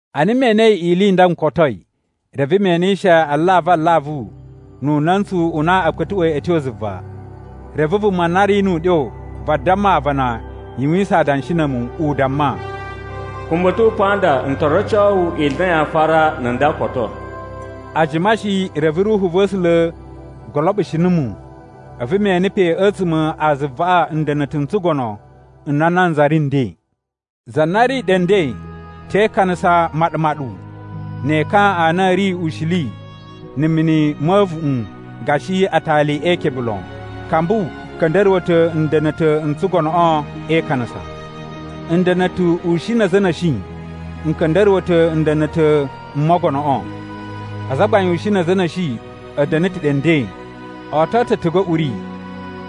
Ana me enei ili i nda n kotoi, reve me enishe alavu alavu nu una̱ntsu u na a̱ kpa̱tuꞌwa̱i a̱ tyo zuva. Reve vuma na ri nu uɗyo vadamma aavana yuwisan adanshi na̱ a̱mu, u damma, “Kumba a̱ ta̱wa̱ pa nda n to roco wu ili i na yaa fara na̱ nda koto.” A jima shi reve Ruhu va̱ A̱sula̱ goloɓushi numu, a̱vu me ene pe a̱tsuma̱ a zuvaꞌa nda̱na̱ta̱ n tsugono n na nanza ri nden. Za na ri ɗe nden te ikanasa maɗu-maɗu ne ekan a na a̱ ri ushili na̱ mini ma̱ a̱a̱vuꞌun gashi atali e ikebe lon. Kambu ka̱nda̱ruwa̱ ta̱ nda̱na̱ta̱ n tsugonoꞌo e ikanasa. Nda̱na̱ta̱ ushin na̱ a̱za̱ a̱ na̱shi n ka̱nda̱ruwa̱ ta̱ nda̱na̱ta̱ m mogonoꞌo. Azagbain ushin na̱ a̱za̱ a̱ na̱shi a̱ da̱na̱ ta̱ ɗe nden. O oto ta̱ a̱tugu a̱ uri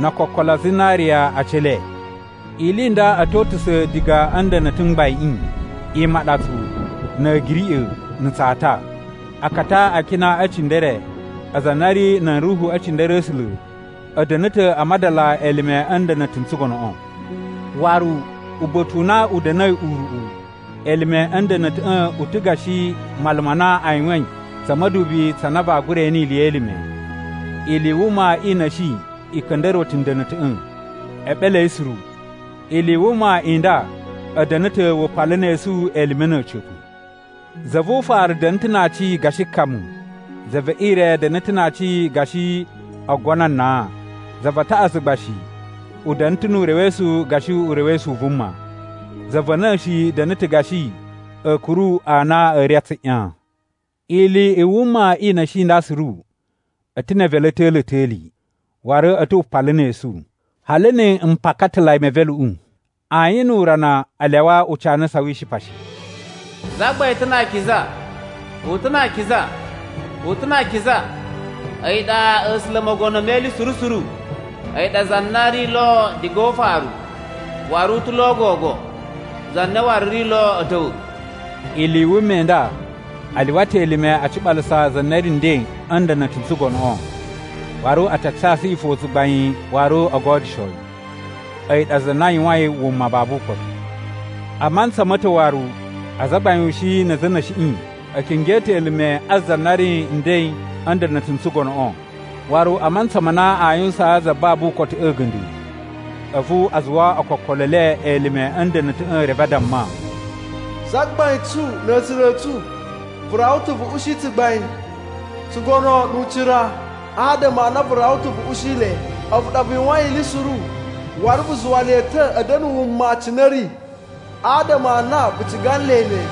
no okokolo a zinariya a aci e le. Ili i nda a̱ to utusa̱ diga a̱ nda̱na̱ta̱ m gbaiꞌin: imaɗatsu, na̱ a̱giriꞌa̱, na̱ tsata. Akata a akina e cindere, aza a na a̱ ri nan ruhu e cindere a̱ A̱sula̱, a̱ da̱na̱ ta̱ a madala elime a̱ nda̱na̱ta̱ n tsugonoꞌo. Waru, uba̱ta̱ u na u da̱na̱i uruꞌu elime a̱ nda̱na̱ta̱ꞌa̱ u ta̱ gashi mala ma na a yuwain tsa̱ ma̱dubi tsa na vaa gura ene ili ye elime. Ili i wuma i na̱shi i ka̱nda̱ruwa̱ ta̱ nda̱na̱ta̱ꞌa̱, eɓele a̱ yi suru. Ili i wuma i nda a̱ da̱na̱ ta̱ wupalu ne esu elime na̱ a̱ca̱pa̱. Za vu ufaru da̱na̱ ta̱ na aaci gashi kamu. Za ve ire da̱na̱ ta̱ na aaci gashi oogono a nan. Za va taꞌatsu gba shi u da̱na̱ ta̱ nu urewesu gashi urewesu u vuma. Za va̱ na̱shi da̱na̱ ta̱ gashi a̱a̱kuru a na a̱ ri a tsuꞌyan. Ili i wuma i na̱shi i nda suru a̱ ta̱ ne evelu a̱ ta̱li ta̱li, waru a̱ ta̱ wupalu ne esu, hali na a mpakatalai me eveluꞌu. Ayin nu urana a lyawa ucanasa wi ishipa shi: “Zagbain ta̱ na akiza. U ta̱ na akiza. U ta̱ na akiza. A̱yi ɗa A̱sula̱ Mogono me Ili Suru Suru. A̱yi ɗa za na ri lo diga o ufaru, waru u ta̱ lo gogo, za na waru ri lo a̱ ta̱wa̱.” Ili i wuma i nda a lyuwa ta̱ elime a ciɓalasa za na ri nden a̱ nda̱na̱ta̱ n tsugonoꞌo. Waru a ta casu yi fo tsugbain waru o godyusho yi. A̱yi ɗa za na yuwain wuma babu ukotu. A mantsa ma̱ ta̱ waru azagbain ushin na̱ a̱za̱ a̱ na̱shiꞌi a̱ kingyo ta̱ elime a za na ri nden a̱ nda̱na̱ta̱ n tsugonoꞌo. Waru a mantsa ma na a yuwusaan za babu ukotuꞌu a̱ga̱nda̱, a̱vu a zuwa okokolo e le elime a̱ nda̱na̱ta̱ꞌa̱ reve a damma, “Zagbain tsu na̱ A̱sula̱ a̱ tsu, vu rawa ta̱ vu ushi tsugbain, tsugono nu ucira adama a na vu rawa ta̱ vu ushi le. A̱vu ɗa vu yuwain ili suru, waru vu zuwa le ta̱ a̱ da̱na̱ wuma cine a̱ ri adama a na vu ciga nle ne.”